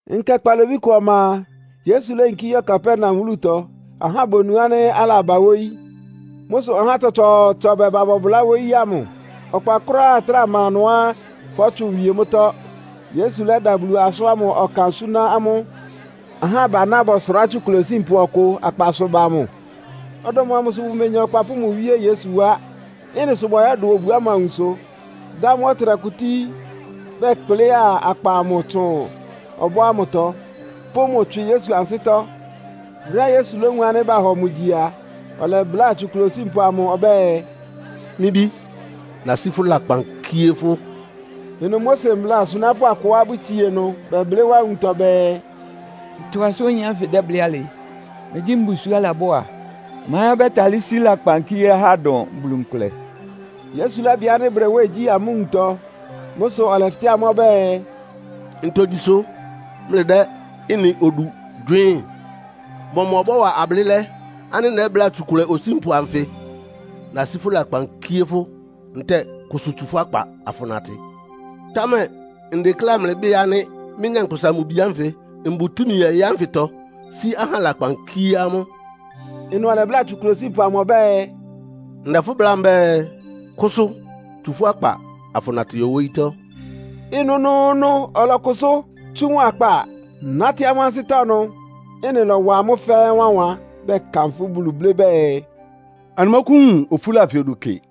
Nkɛ kpalobí kʋ ɔma a, Yesu léyinkí yɔ́ Kapernaum wúlutɔ. Ahá bonu ánɩ́ alaba wóyí. Mʋ́ sʋ ahá tsɔtsɔɔtsɔ bɛba bɔbʋlá wóyí ámʋ. Ɔkpa kʋ́ráá ɩtráa ma ɩnʋá fɔ́tsʋn wie mʋ́tɔ́. Yesu lɛ́da Bulu asʋ́n ámʋ ɔkan súná amʋ́. Ahá abaná bɔsʋrá tsukʋlɛ osínpʋ ɔkʋ akpasʋ ba mʋ. Ɔdɔm amʋ sʋ bʋmenya ɔkpa pʋ́ mʋ wíé Yesu wá. Ɩ́nɩ sʋ bɔyɔ́dʋ obu ámʋ awunso, dá mʋ́ ɔtɩnɛkʋ tíí, bɛkplɩ́a akpa amʋ tsʋn ɔbɔ́ ámʋtɔ, pʋ́ mʋ tswɩ Yesu ansɩ́tɔ́. Brɛ́á Yesu lówun ánɩ́ bahɔ mʋ gyi a, ɔlɛbláa tsukʋlɛ osínpʋ amʋ ɔbɛ́ɛ, “Mɩ́ bí, nasí fʋ́ lakpan kíé fʋ́.” Ɩnʋ Mose mbla asunápʋ́ akʋá bʋtsie ɩnʋ, bɛblɩ́ wá nwuntɔ bɛɛ, “Ntɔ asʋ́n oyin ánfɩ dɛ́blɩ́ alɩ? Megyí mbusuo álabɔ́ á? Ma ɛ́ ɔbɛ́talɩ́ sí lakpan kíé ahá dʋn Bulu nkʋlɛ?” Yesu lɛ́bɩ ánɩ́ bʋdɛ nwɛ́ɛn gyí amʋ́ nwuntɔ. Mʋ́ sʋ ɔlɛfɩtɛ́ amʋ́ ɔbɛ́ɛ, “Ntogyi sʋ́ mlɩdɛ́ ɩ́nɩ odu gywɩɩ́n? Mɔmʋ bɔ́wa ablɩ́lɛ́ ánɩ́ nɛ́bláa tsukʋlɛ osínpʋ anfɩ? ‘Nasí fʋ́ lakpan kíé fʋ́’ ntɛ́ɛ ‘Kʋsʋ tsu fʋ́ akpa afʋnatɩ?’ Támɛ ndekléá mlɩbɩ́ɩ ánɩ́ mɩ́, Nyankpʋsa-Mʋ-Bi ánfɩ mbʋ túmi ɔyɩ́ ánfɩtɔ sí ahá lakpan kíé amʋ́.” Ɩnʋ ɔlɛbláa tsukʋlɛ osínpʋ amʋ ɔbɛ́ɛ, “Ndɛ fʋ́ bláa mbɛ́ɛ, kʋsʋ! Tsu fʋ́ akpa afʋnatɩ yɔ wóyítɔ́!” Ɩnʋnʋʋnʋ ɔlɔkʋsʋ́, tsú mʋ akpa, nátɩ́ amʋ́ ansɩ́tɔ́ ɩnʋ. Ɩ́nɩ lɔ́wa amʋ́ fɛ́ɛ́ wánwan, bɛkanfʋ́ Bulu blɩ́ bɛɛ, “Anɩmɔ́kʋ́wun ofúla anfɩ odu kɩ.”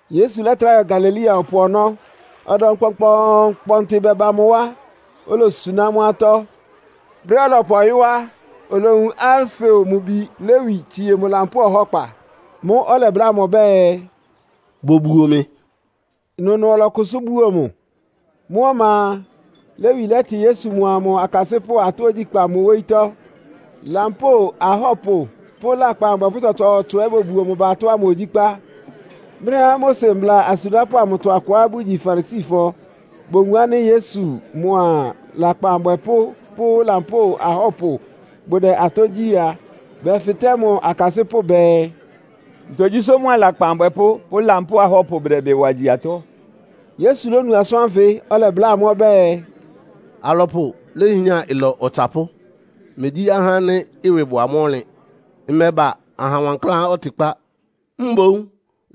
Yesu lɛ́trá yɔ Galilea ɔpʋ ɔnɔ́. Ɔdɔm kpɔnkpɔɔnkpɔntɩ bɛba mʋ wá, olosuná amʋ́ atɔ́. Brɛ́á ɔlɔpʋ ɔyɔ́ á, olowun Alfeo mʋ bi Lewi tsie mʋ lampóo ɔhɔ́kpa. Mʋ́ʋ́ ɔlɛbláa mʋ ɔbɛ́ɛ, “Bobuo mɩ.” Ɩnʋnʋ ɔlɔkʋsʋ́ buo mʋ. Mʋ́ ɔma a, Lewi lɛ́tɩ Yesu mʋa mʋ akasɩ́pʋ́ atɔ́ ogyíkpá mʋ wóyítɔ́. Lampóo ahɔ́pʋ pʋ́ lakpan abwɛpʋ́ tsɔtsɔɔtsɔ ɛ́ bobuo mʋ ba atɔ́ ámʋ ogyíkpá. Brɛ́á Mose mbla asunápʋ́ amʋtɔ akʋá bʋgyi Farisifɔ bowun ánɩ́ Yesu mʋa lakpan abwɛpʋ́ pʋ́ lampóo ahɔ́pʋ bʋdɛ atɔ́ gyí a, bɛfɩtɛ́ mʋ akasɩ́pʋ́ bɛɛ, “Ntogyi sʋ́ mʋa lakpan abwɛpʋ́ pʋ́ lampóo ahɔ́pʋ bʋdɛ ɩbɩ wa gyi atɔ́?” Yesu lónu asʋ́n ánfɩ, ɔlɛbláa amʋ́ ɔbɛ́ɛ, “Alɔpʋ léhián ɩlɔ ɔtsapʋ́, megyí ahá ánɩ́ ɩwɩ bʋ amʋ́ ɔnlɩn. Mmɛba aha wankláán ɔtɩkpá, mboún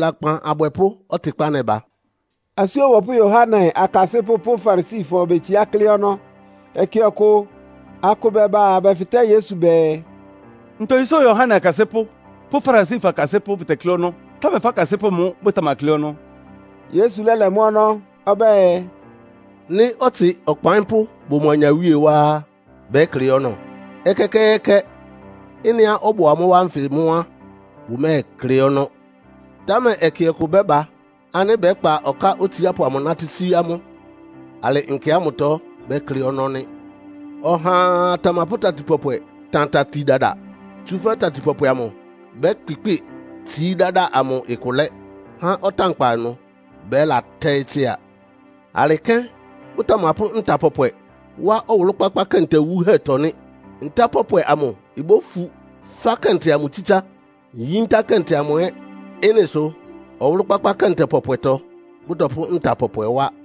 lakpan abwɛpʋ́ ɔtɩkpá nɛba.” Asú Ɔbɔpʋ́ Yohane akasɩ́pʋ́ pʋ́ Farisifɔ bʋtetsíá klɩ́ ɔnɔ́. Ɛkɛ ɔkʋ akʋ bɛba bɛfɩtɛ́ Yesu bɛɛ, “Ntogyi sʋ́ Yohane akasɩ́pʋ́ pʋ́ Farisifɔ akasɩ́pʋ́ bʋtɛklɩ́ ɔnɔ́, támɛ fʋ́ akasɩ́pʋ́ mʋ́ bʋtamaklɩ́ ɔnɔ́?” Yesu lɛ́lɛ mʋ́ ɔnɔ́ ɔbɛ́ɛ, “Nɩ́ ɔtsɩ ɔkpaɩ́npʋ́ bʋ mʋ anyawíe wá á, bɛ́klɩ́ ɔnɔ́? Ɛkɛkɛɛkɛ! Ɩ́nɩá ɔbʋ amʋ́ wá ánfɩ mʋ́ á, bʋmɛ́ɛklɩ́ ɔnɔ́. Támɛ ɛkɛ kʋ bɛ́ba ánɩ́ bɛ́kpa ɔká otsiápʋ amʋ nátɩ́ sí amʋ́. Alɩ nkɛ ámʋtɔ bɛ́klɩ́ ɔnɔ́ nɩ́. “Ɔhaa tamapʋ́ tati pɔpwɛ tan tati dada. Tsúfɛ́ tati pɔpwɛ amʋ bɛ́kpɩkpɩ́ɩ tsií dáda amʋ ɩkʋ lɛ́, há ɔtánkpa ɩnʋ bɛ́latɛ́ɩ́ tsɩ́a. Alɩ kɛ́n bʋtamapʋ́ nta pɔpwɛ wá ɔwʋlʋ́-kpákpá kɛntɛ wuhɛ́tɔ́ nɩ́. Nta pɔpwɛ amʋ ibófu fá kɛntɛ amʋ tsítsá, yíntá kɛntɛ amʋ ɛ́. Ɩ́nɩ sʋ ɔwʋlʋ́-kpákpá kɛntɛ pɔpwɛtɔ bʋ́tɔpʋ́ nta pɔpwɛ wá.”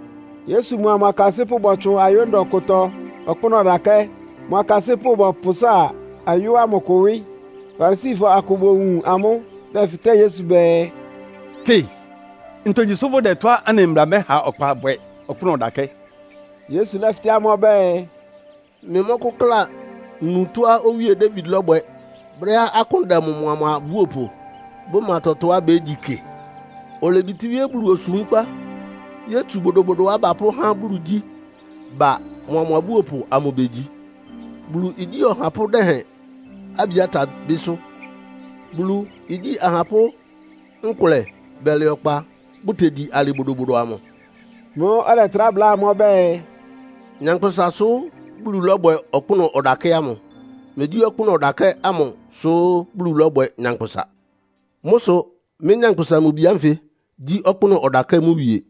Yesu mʋa mʋ akasɩ́pʋ́ bɔtsʋn ayó ndɔ kʋtɔ ɔkpʋ́nʋ́ ɔdakɛ́, mʋ akasɩ́pʋ́ bɔpʋsáa ayó ámʋ kʋ wɩ́. Farisifɔ akʋ bowun amʋ́, bɛfɩtɛ́ Yesu bɛɛ, “Kɩ, ntogyi sʋ́ bʋdɛ tɔ́á anɩ mbla mɛha ɔkpa bwɛ ɔkpʋ́nʋ́ ɔdakɛ́?” Yesu lɛ́fɩtɛ́ amʋ́ ɔbɛ́ɛ, “Mlɩmɔ́kʋ́kla nu tɔ́á Owíe Dawid lɔ́bwɛ brɛ́á akʋ́n dɛ mʋa mʋ abúopʋ, bʋma tɔtɔá bégyi kɩ? Olebitíwíé Bulu osúmkpa yótsu bodobodoá bapʋ́há Bulu igyí ba, mʋa mʋ abúopʋ amʋ begyi, Bulu igyí ɔhapʋ́ dɛhɛn Abiata bɩ́sʋ́. Bulu igyí ahapʋ́ nkʋlɛ bɛlɛ ɔkpa bʋ́tegyi alɩ bodobodo amʋ.” Mʋ́ʋ́ ɔlɛtrá bláa amʋ́ ɔbɛ́ɛ, “Nyankpʋsa sʋ́ Bulu lɔ́bwɛ ɔkpʋ́nʋ́ ɔdakɛ́ ámʋ. Megyí ɔkpʋ́nʋ́ ɔdakɛ́ ámʋ sʋ́ Bulu lɔ́bwɛ nyankpʋsa. Mʋ́ sʋ mɩ́, Nyankpʋsa-Mʋ-Bi ánfɩ gyí ɔkpʋ́nʋ́ ɔdakɛ́ mʋ wie!”